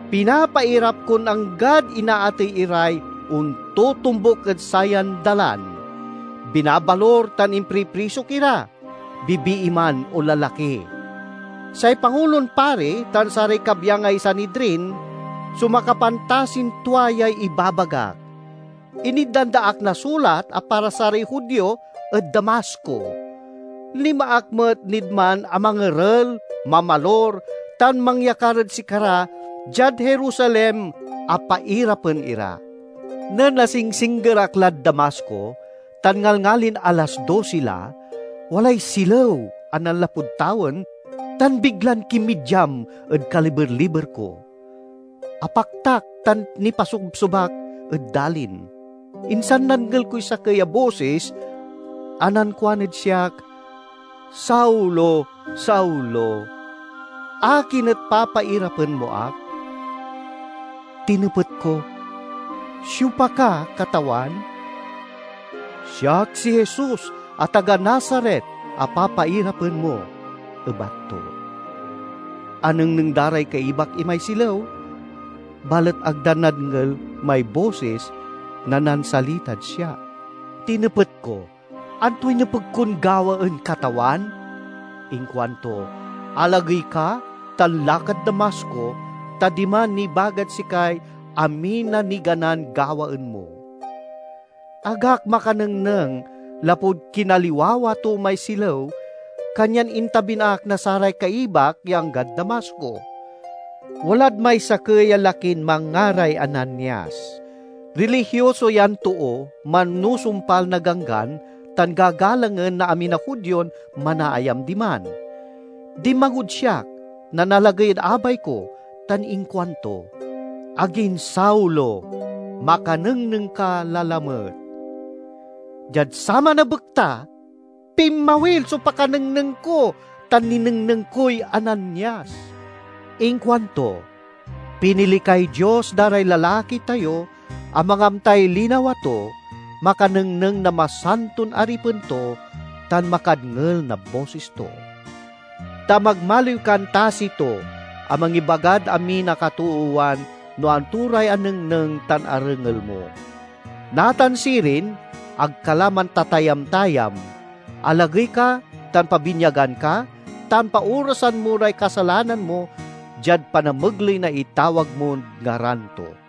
Pinapairap kon anggad inaatey iray ontotombuk ed sayan Dalan. Binabalur tan impriprisok ira, bibii man o lalaki. Say Pangulon Pari tan saray kabyangay Sanidrin so makapantasin tua yay ibabagak. Initdan da ak na sulat a para saray Judio ed Damasco. Linma ak met nid man a mangerel, mamalur tan mangyakar ed sikara diad Jerusalem a pairapen ira." "Nen asingsingger ak lad Damasco, tan ngalngalin alas dosi la, walay silew a nanlapud tawen tan biglan kinmidyam ed kaliber-liber ko. Apaktak tan nipasobsob ak ed dalin, insan nadngel koy sakey a bosis a nankuan ed siak, 'Saulo, Saulo! Akin et papairapen mo ak?' Tinepet ko, 'Siopa ka, Katawan?' 'Siak si Jesus a taga Nazaret a papairapen mo,' ebat to. Anengneng da ray kaibak imay silew, balet ag da nadngel may bosis na nansalitad siak. Tinepet ko, 'Antoy nepeg kon gawaen, Katawan?' Inkuanto, 'Alagey ka, tan lakad Damasco, ta diman nibagad sikay amin a niganan gawaen mo.' Ag ak makanengneng lapud kinaliwawa to may silew, kanyan intabin ak na saray kaibak ya anggad Damasco. "Walad may sakey a lakin manngaray Ananias. Rilihioso yan too, manusumpal na Ganggan, tan gagalangen na amin a Judion manaayam diman. Dinmagod siak, nanalagey ed abay ko, tan inkuanto, 'Agin Saulo, makanengneng ka la lamet!' Diad saman a bekta, pinmawil so pakanengneng ko tan ninengneng koy Ananias. Inkuanto, 'Pinili kay Dios da ray lalaki tayo a mangamtay linawa to, makanengneng na Masanton Aripen to, tan makadngel na bosis to. Ta magmaliw kan tasi to a mangibagad amin a katoowan no anto ray anengneng tan arengel mo. Natan sirin, ag ka la mantatayam-tayam. Alagey ka tan pabinyagan ka, tan paorasan mo ray kasalanan mo diad panamegley na itawag mod ngaran to.'"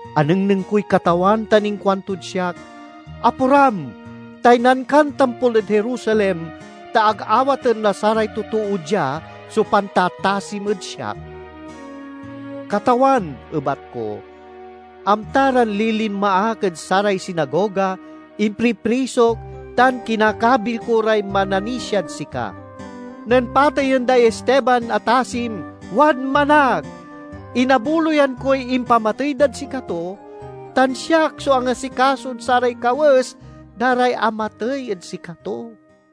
Anengneng koy Katawan tan inkuantod siak, 'Aporam! Taynan kan tampol ed Jerusalem, ta ag awaten na saray totoo dia so pantatasim ed siak!' 'Katawan,' ebat ko, 'amta ran lilinma ak ed saray sinagoga, impriprisok tan kinakabil ko ray mananisiad sika. Nen pateyen day Esteban a tasim, wadman ak. Inabuloyan koy impamatey dad sikato, tan siak so angasikasod saray kawes da ray amatey ed sikato.'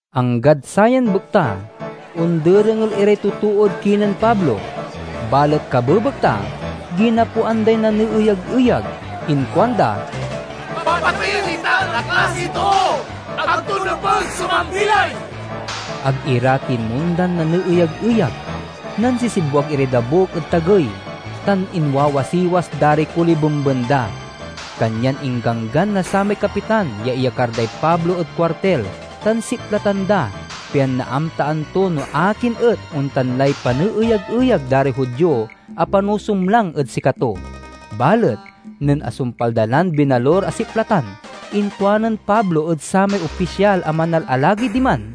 Anggad sayan bekta, onderengel iray totood kinen Pablo; balet kabebekta ginapoan day naneeyag-eyag. Inkuanda, "Papateyen itan a klasiy too! Ag to nepeg so mambilay!" Ag ira tinmondan naneeyag-eyag; nansisibwag iray dabuk ed tagey, tan inwawasiwas da ray kolibemben da. Kanyan ingganggan na samay kapitan ya iyakar day Pablo ed kuartil tan siplatan da, pian naamtaan to no akin et ontan lay paneeyag-eyag da ray Judio a panusumlang ed sikato. Balet nen asumpal da lan binalur a siplatan inkuanen Pablo ed samay opisyal a manalalagey diman,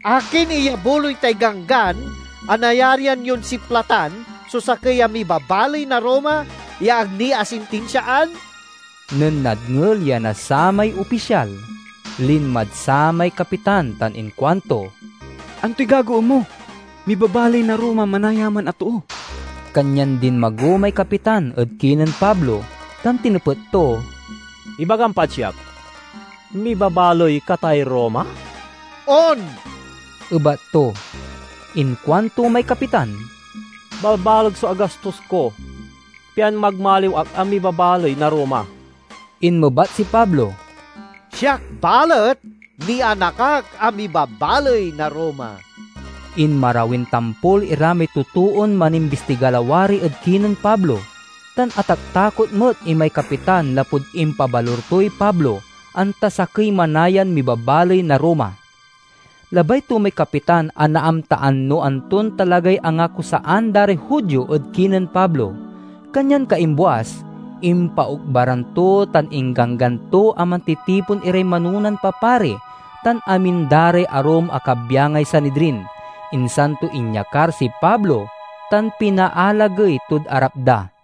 "Akin iyabuloy tay ganggan a nayarian yon siplatan so sakey a mibabaley na Roma ya ag ni asintinsiaan?" Nen nadngel ya na samay opisyal, linmad samay kapitan tan inkuanto, "Antoy gagawaen mo? Mibabaley na Roma manaya man a too!" Kanyan dinmago may kapitan ed kinen Pablo tan tinepet to, "Ibagam pad siak: mibabaley ka tay Roma?" "On," ebat to. Inkuanto may kapitan, "Balbaleg so agastos ko, pian magmaliw ak a mibabaley na Roma." Inmebat si Pablo, "Siak balet, nianak ak a mibabaley na Roma." Inmarawin tampol ira may totoon manimbistiga lawari ed kinen Pablo, tan ataktakot met imay kapitan lapud impabalur toy Pablo, anta sakey manayan mibabaley na Roma. Labay to may kapitan a naamtaan no anton talagay angakusaan da ray Judio ed kinen Pablo. Kanyan kaimbuas, impaokbaran to tan ingganggan to a mantitipon iray manonan papari tan amin da ray arum a kabyangay Sanidrin. Insan to inyakar si Pablo tan pinaalagey tod arap da.